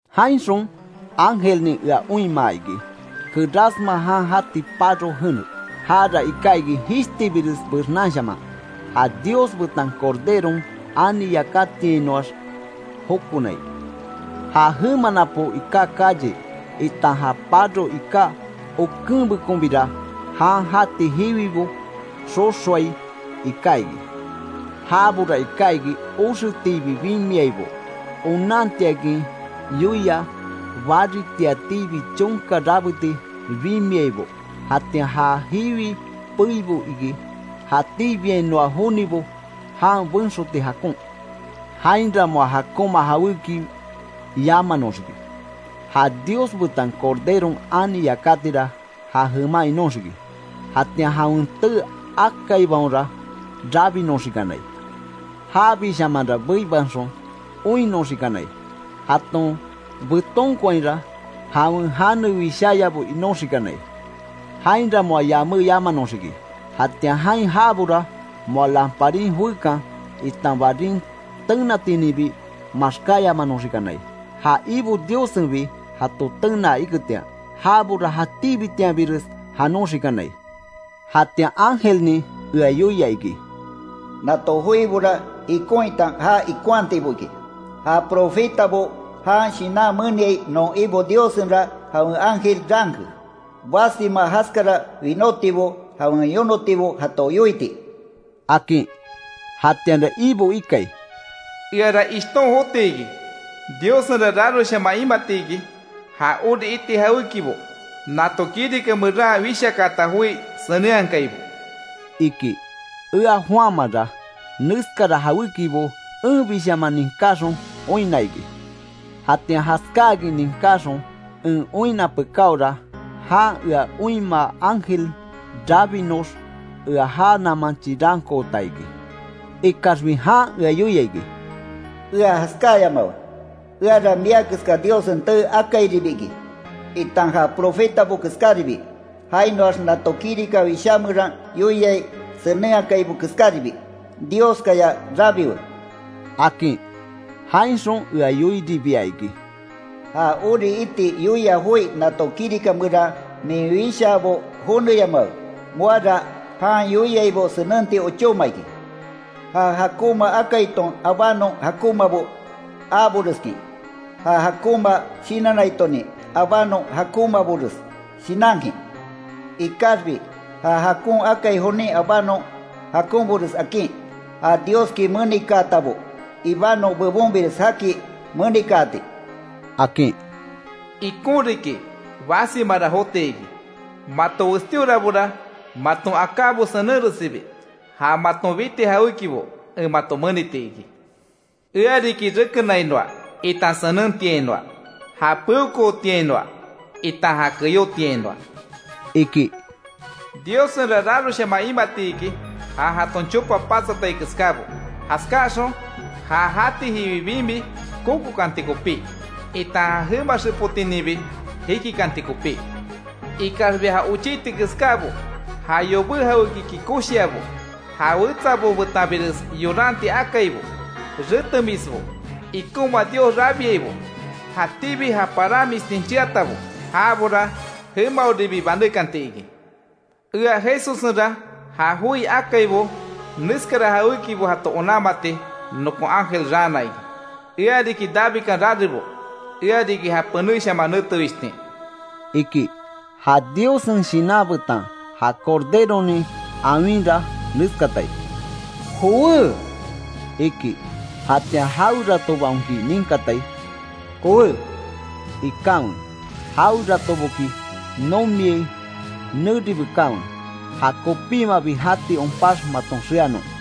Jainxon ángelnin ea oinmaa iki, kerásma jan jati paro jene. Jara iká iki jishtibires bexnanshaman, ja Dios betan Corderon ani yakatiainoax jokonai. Ja jema napo iká calle, itan ja paro iká okenbekonbira, jan jati jiwibo xoxoai iká iki. Jabora iká iki oxetiibi bimiaibo, onantiakin yoia baritiatiibi chonka rabeti bimiaibo; jatian ja jiwi peibo iki jatíbiainoa jonibo jan benxoti jakon. Jainra moa jakonma jawéki yamanoxiki. Ja Dios betan Corderon ani yakatira ja jeman inóxiki. Jatian jawen tee akaibaonra rabinoxikanai. Jabishamanra beibanxon oinnoxikanai, jaton betonkoainra jawen jane wisháyabo inoxikanai. Jainra moa yaméyamanoxiki, jatian jain jaabora moa lamparin joekan, itan barin tenatininbi maxkáyamanoxikanai. Ja Ibo Diossenbi jato tenaa iketian. Jabora jatíbitianbires janoxikanai. Jatian ángelnin ea yoia iki: “Nato joibora ikon itan ja ikonhatibo iki. Ja profetabo jan shinan meniai non Ibo Diossenra jawen ángel raanke, basima jaskara winótibo jawen yonotibo jato yoiti”, akin. Jatianra Ibo ikai: “¡Eara ishton joti iki! ¡Diossenra raroshaman imati iki, ja ori iti jawékibo nato kirika meran wishakaata joi senenhakaibo!” iki. Ea Juanmanra, neskara jawékibo enbishaman ninkáxon oinna iki. Jatian jaskáakin ninkáxon, en oinna pekáora, jan ea oinmaa ángel rabinox ea já naman chirankoota iki. Ikaxbi jan ea yoia iki: “Ea jaskáayamawe. Eara mia keska Diossen tee akairibi iki, itan ja profetabo keskáribi, jainoax nato kirika wishá meran yoiai senenhakaibo keskáribi. Dioskaya rabiwe”, akin. Jainxon ea yoiribia iki: “Ja ori iti yoia joi nato kirika meran min wishaabo joneyamawe. Moara jan yoiaibo senenti ochóma iki. Ja jakonma akaiton abanon jakonmabo aaboreskin, ja jakonma shinannaitonin abanon jakonmabores shinankin. Ikaxbi ja jakon akai jonin abanon jakonbores akin; ja Dioski menikaatabo ibanon bebonbires jaki menikaati”, akin. “Ikon riki basimara jotiki; mato westíorabora maton akábo senenresibi, ja maton biti jawékibo en mato meniti iki. Ea riki rekenainoa, itan senentiainoa. Ja peokootiainoa itan ja keyótiainoa”, iki. Diossenra raroshaman imati iki, ja jaton chopa patsatai keskábo; jaskaxon ja jati jiwi bimi kokokanti kopí, itan ja jema xepotininbi jikikanti kopí. Ikaxbi ja ochiti keskábo, ja yobé jawékiki koshiabo, ja wetsabo betanbires yoranti akaibo, retemisbo, ikonma dios rabiaibo, jatíbi ja paranmistin cheatabo, jabora jemaoribi banékanti iki. “Ea Jesussenra ja joi akaibo neskara jawékibo jato onanmati nokon ángel raana iki. Ea riki Davidkan rarebo, ea riki ja penéshaman nete wishtin”, iki. Ja Diossen Shinan betan ja Corderonin awinra neskatai: “¡Jowé!” iki. Jatian jaweratobaonki ninkatai: “¡jowé!” ikanwe. Jaweratoboki nomiai, neri bekanwe, ja kopímabi jati onpax maton xeanon.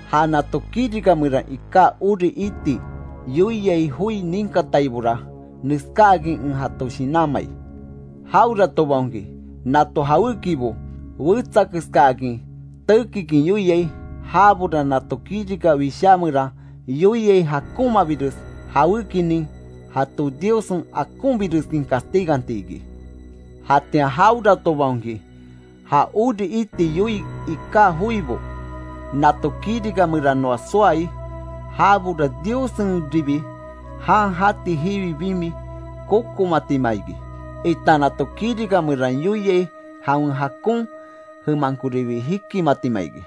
Ja nato kirika meran iká ori iti yoiai joi ninkataibora, neskáakin en jato shinanmai: Jaweratobaonki nato jawékibo wetsakeskaakin tekikin yoiai, jabora nato kirika wishá meran yoiai jakonmabires jawékinin jato Diossen akonbireskin castiganti iki. Jatian jaweratobaonki, ja ori iti yoii iká joibo nato kirika meranoa soai, jabora Diossenribi jan jati jiwi bimi kokomatima iki, itan nato kirika meran yoiai jawen jakon jemankoribi jikimatima iki.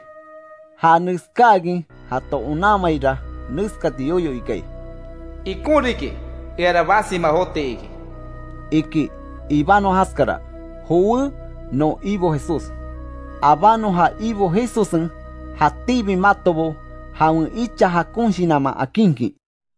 Ja neskáakin jato onanmaira neskati yoyo ikai: “Ikon riki eara basima joti iki”, iki. Ibanon jaskara. ¡Jowé non Ibo Jesús! Abánon ja Ibo Jesussen jatíbi matobo jawen icha jakon shinanman akinkin.